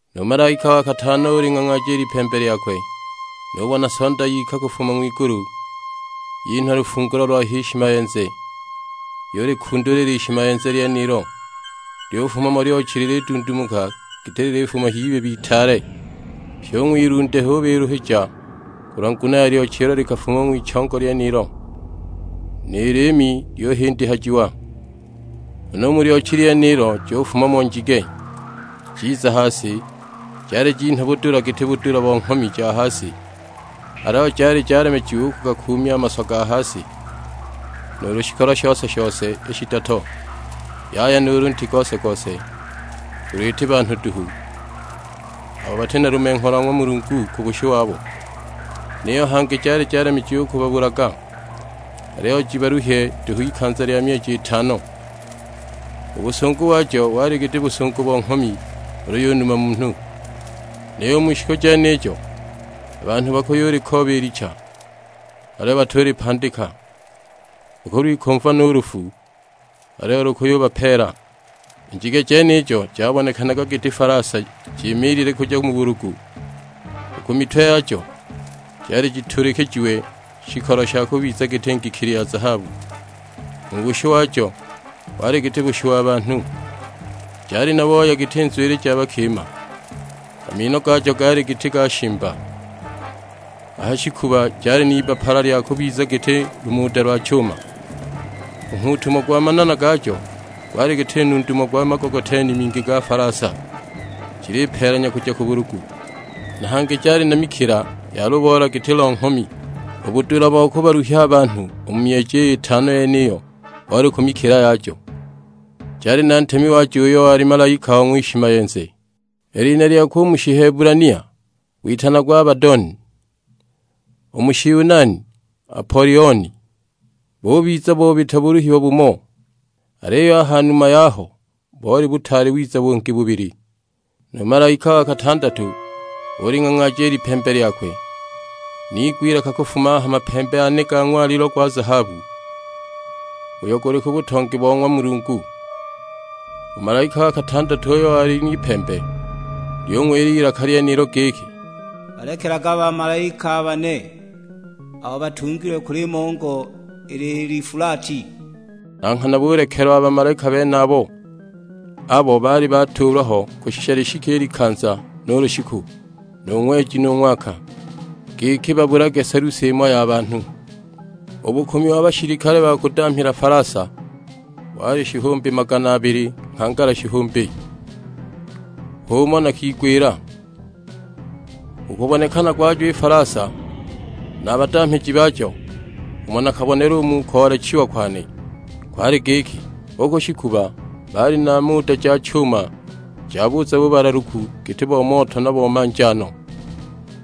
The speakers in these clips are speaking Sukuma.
Nu malaika wa katano uling'ang'aaja i lipembe lyakwe; nubona Sonda yika kufuma ng'wigulu, yinhwa lufungulo lwa h'ishimayenze. Yulikundula i lishimayenze lyenilo, lyufuma mo lyochi lilidundumuka giti lilifuma h'ibibi itaale; pyi u ng'wilunde hubiluhija kulwa nguno ya lyochi ilo likafuma ng'wichongo lyenilo, ni liimi lyuhindihajiwa. Huna u mu lyochi lyenilo jufuma mo njige, jiza ha si; jali jinhwa budula giti budula bo nghomi ja ha si. Aliyo jali jalemejiwa u kugakuumya a maswa ga ha si, nuulu shikolo shose-shose i shidoto, yaya nuulu nti gose-gose, ulu iti banhu duhu, abo bati na lumengho lwa ng'wa Mulungu ku bushu wabo. Niyo hangi jali jalemejiwa u kubabulaga, aliyo jibaluhye duhu ikanza lya myeji itano. U busungu wajo wali giti busungu bo nghomi ulu yunuma munhu! Niyo u mu shiku jenijo a banhu bakuyulikooba i licha, aliyo batulipandika;, bakulwikumva no u lufu, aliyo lukuyubapeela. I njige jenijo jabonekanaga giti falasa jimaliilile kuja mu bulugu; u ku mitwe yajo jali jituulikijiwe shikolo sha kubiza giti ngikili ja zahabu, u bushu wajo wali giti bushu wa banhu. Jali na booya giti nzwili ja bakima, a mino gajo gaali giti ga shimba. A ha shikuba jali n'ibbapala lya kubiza giti lumuda lwa chuma. U nghuutumo gwa manana gajo gwali giti nundumo gwa magogoteni mingi ga falasa jilipeelanya kuja ku bulugu. Na hangi jali na mikila ya luboola giti lo nghomi; u budula bo kubaluhya a banhu u mu myeji iy'itano yeniyo boli ku mikila yajo. Jali na ntemi wajo uyo wali malaika wa ng'wishimayenze; i lina lyakwe u mu Shihebulania witanagwa Abadoni, u mu Shiyunani Apolioni makulu gaho nyagaja.'. Bubiza bobita buluhiwa bumo, aliyo a ha numa yaho boli butaali wiza bungi bubili. Nu malaika wa katandatu uling'ang'aaja i lipembe lyakwe; niigwa ilaka kufuma a ha mapembe ane ga ng'walilo gwa zahabu, uyo guli ku butongi bo ng'wa Mulungu. U malaika wa katandatu uyo wali n'ipembe lyung'wila i lilaka lyenilo giki, "Balekelage a bamalaika a bane, abo batungilwe ku limongo, i Lifulati." Na nghana bulekelwa a bamalaika benabo, abo baali batuulwa ho kushisha lishike i likanza nu lushiku, nu ng'weji nu ng'waka, giki babulage selusi imo ya banhu. U bukumi wa bashilikale ba kudamhila falasa wali shihumbi magana abili nghangala shihumbi, h'umo nakigwila. U kubonekana gwajo i falasa na a badamhiji bajo, umo nakabonela u mu koolekejiwa kwane, kwali giki; u ku shikuba baali na muda ja chuma ja buza bubalaluku giti bo moto na bo manjaano.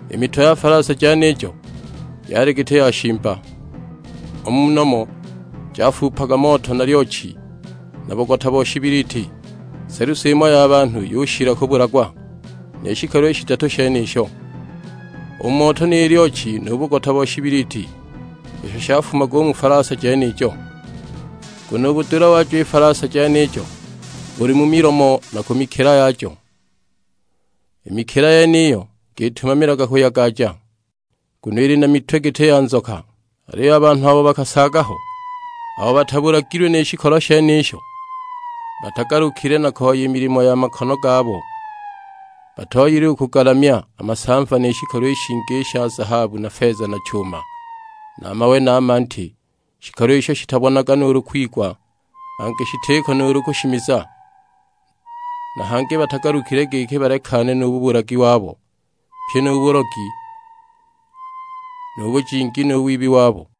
I mitwe ya falasa jenijo yali giti ya shimba, u mu nomo jafuupaga moto na lyochi na bugota bo shibiliti. Selusi imo ya banhu yushila kubulagwa ni shikolo i shidatu shenisho: u moto ni lyochi nu bugota bo shibiliti, isho shafumaga u mu falasa jenijo. Nguno u budula wajo i falasa jenijo buli mu milomo na ku mikila yajo. I mikila yeniyo jikitumamilaga kuyagaja, nguno ili na mitwe giti ya nzoka. Aliyo a banhu abo bakasaaga ho, abo batabulagilwe ni shikolo shenisho, batagalukile na koya i milimo ya makono gabo. Batooyile u kugalamya a masamva ni shikolo i shingi i sha zahabu na feza na chuma, na mawe na manti; shikolo isho shitabonaga nuulu kwigwa, hangi shitiko nuulu kushimiza! Na hangi batagalukile giki balekane nu bubulagi wabo, pyi nu bulogi, nu bujingi, nu wibi wabo!